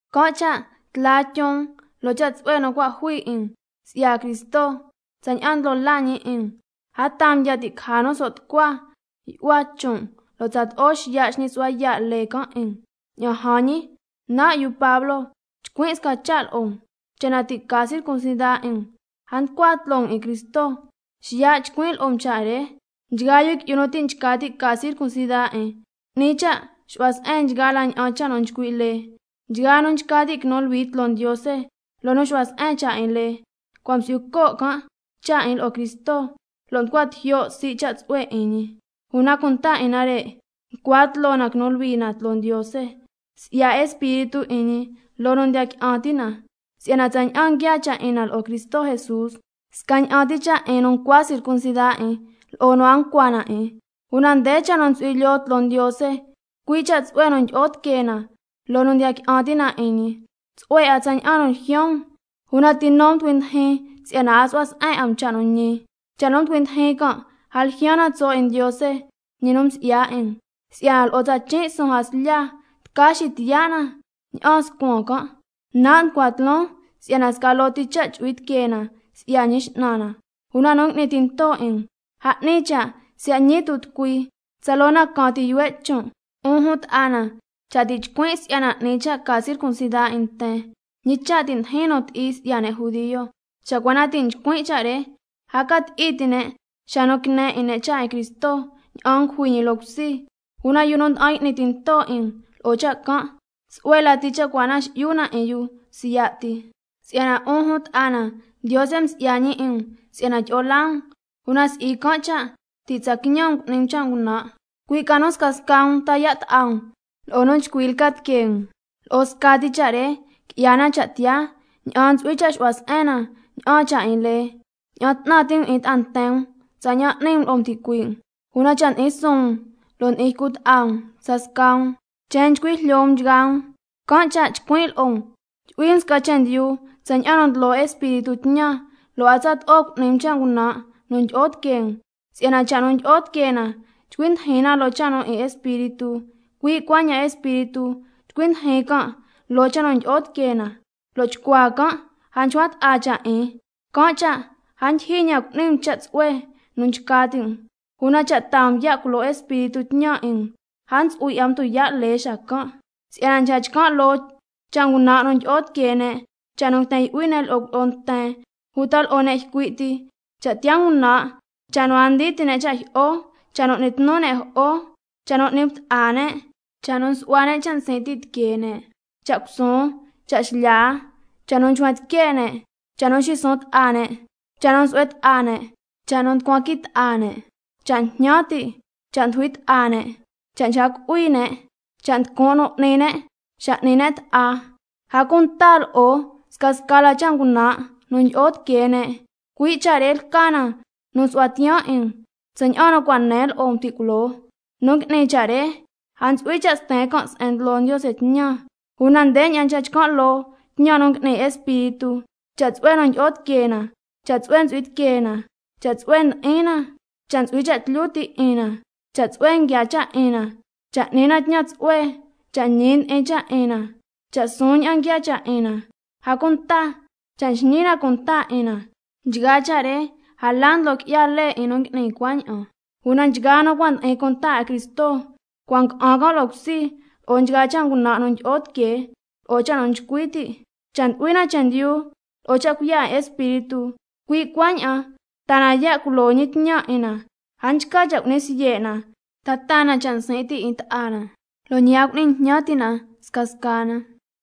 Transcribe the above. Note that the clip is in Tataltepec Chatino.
Can' cha' tla tyun um loo cha' tsu'hue nu cua' jui 'in na si'ya Cristo tsaña'an ndlo laa ñi 'in na, a taa um ya' ti' caja nu so' tucua yu'hua chon' um, lo' tsato'o xiya' xñi su'hua yaa' lee can' 'in um. Ña'an jan ñi, nan' yu Pablo chcuin' sca cha' lo'o um: Cha' na ti' ca circuncida 'in um, a nducua tloo um 'in Cristo xacan'. Xiya' xitucuin chcuin' lo'o um cha' re: Nchgaa yu qui'yu nu ti' nchca ti' ca circuncida 'in, 'ni cha' xu'hua se'en nchgaa la ña'an cha' nu nchcui' lee. Nchgaa nu nchca ti' quinu luhui tloo Ndiose loo nu xu'hua se'en cha' 'in lee, cua' msi'yu co' can' cha' 'in lo'o Cristo, lo' mducua tijyo' sii' cha' tsu'hue 'in ñi. Una cunta 'in nare' nducua tloo na quinu luhui na tloo Ndiose si'ya Espíritu 'in ñi loo nu ndiya qui'an ti' na. Si'yana tsaña'an nguiaa cha' 'in na lo'o Cristo Jesús, scaña'an ti nu cua' ncua circuncida 'in lo'o nu a nchca ca na 'in, una nde cha' nu ntsu'hui lyoo tloo Ndiose, cui' cha' tsu'hue nu ndyi'o tiquee na loo nu ndiya qui'an ti' na 'in ñi. Tsu'hue 'a tsaña'an nu ljyaan um, ¿una ti nu mducui ndijin si'yana a xu'hua se'en 'a um cha' nu ñi? Cha' nu mducui ndijin can' a ljyaan na tso' 'in Ndiose, ñi nu msi'ya 'in um. Si'yana lo'o tsa chin' suun jaslya tca xitiyaa' na ña'aan scuan jaslya can'. Nan' nducua tloon si'yana sca loo ti cha' chu'hui tiquee na si'ya Ñi X'nan na, una nu ngui'ni tinto 'in um, a 'ni cha' siya' ñi tu' tucui, tsaloo na caan ti yuhue' chon'. 'Un jun ta'a na, cha' nan' ti' chcuin' si'yana 'ni cha' ca circuncida 'in nten, ¿Ñi cha' ti' ndijin nu ti'i si'ya ne' judio cha' na can'? Cha' cua na ti' nchcuin' cha' re a ca ti'i ti' ne' xa nu quine 'in ne' cha' 'in Cristo ña'an ngujui ñi loo cusi. Una yu nu nda'an y'ni tinto 'in um lo'o cha' can', ¡tsu'hue lati cha' cua na xi'yu na 'in yu siya' ti! Si'yana 'un jun ta'a na, Ndiose msi'ya ñi 'in um si'yana tyi'o laa um, una si'i can' cha' ti' tsa quiñan um cu'ni um cha' ngunan', cui' ca nu scasca um ta yaa' ta'a um lo'o nu chcui lca tiquee um. Lo'o scati cha' re qui'ya na cha' tiyaa ña'an ntsu'hui cha' xu'hua se'en na ña'aan cha' 'in lee: —Ña'an 'tnan ti' um 'in ta'a nten um tsaña'an n'ni um lo'o um ticuii' um—. Una cha' ndi'in suun um lo' ndi'in ycu ta'a um scasca um, chen nchcui jlyo um nchgaa um. Can' cha' chcuin' lo'o um: Tyu'hui um sca chendyu tsaña'an nu ndlo Espíritu tñan, lo' a tsato'o cu'ni um cha' ngunan' nu ndyi'o tiquee um. Si'yana cha' nu ndyi'o tiquee na nchcui ndijin na loo cha' nu 'in Espíritu, cui' cuaña'an Espíritu nchcui ndijin can' loo cha' nu ndyi'o tiquee na, lo' chcuaa can' a nchcua ta'a cha' 'in, can' cha' a ndyijyi ña'an cu'ni um cha' tsu'hue nu nchca ti' um. Una cha' taa um ya' culo Espíritu tñan 'in um, a ntsu'hui 'a um tuyaa' lee xacan'. Si'yana nchca chcan' loo cha' ngunan' nu ndyi'o tiquee ne': Cha' nu nguiten yu'hui ne' lo'o cuilyi'o nten uta lo'o ne' ycui' ti, cha' tiyaa ngunan', cha' nu a ndii ti' ne' cha' jyi'o, cha' nu n'ni tnu ne' jo'o, cha' nu n'ni bta'a ne', cha' nu nsu'hua ne' cha' nsin' ti' tiquee ne', cha' cusuun, cha' xlya, cha' nu nchcuen tique' ne', cha' nu nxisuun ta'a ne', cha' nu nsu'hue ta'a ne', cha' nu nducuan qui ta'a ne', cha' njñan ti', cha' ndujui ta'a ne', cha' nchca cu'hui ne', cha' nducun' nu n'ni ne' xa n'ni ne' ta'a, a cunta lo'o scasca la cha' ngunan' nu ndyi'o tiquee ne'. Cui' cha' re lca nu nsu'huan tiyaan 'in um, tsaña'an nu cua' nen lo'o um ti' culoo, nu ngui'ni cha' re a ntsu'hui cha' sten can' se'en ndlo Ndiose tñan. Una ndeña'an nchca chcan' loo tñan nu ngui'ni Espíritu: Cha' tsu'hue nu ndyi'o tiquee na, cha' tsu'hue ntsu'hui tiquee na, cha' tsu'hue ndi'in na, cha' ntsu'hui cha' tlyu ti' 'in na, cha' tsu'hue nguiaa cha' 'in na, cha' n'ni na tñan tsu'hue, cha' ñi ndi'in cha' 'in na, cha' suun ña'an nguiaa cha' 'in na, a cunta cha' nxñi na cunta 'in na. Nchgaa cha' re a la ndlo qui'ya lee 'in nu ngui'ni cuaña'an. Una nchgaa nu cua' ndi'in cunta 'in Cristo cua' mjyi'in ca'an can' 'in loo cusi lo'o nchgaa cha' ngunan' nu ndyi'o tiquee lo'o cha' nu nchcui ti'. Cha' ndu'hui na chendyu lo'o cha' cuiya' 'in Espíritu, cui' cuaña'an taa na ya' culo ñi tñan 'in na. A nchca cha' cu'ni siye' na, ta taa na cha' nsin' ti' 'in ta'a na, lo' ñi a cu'ni jñan ti' na scasca na.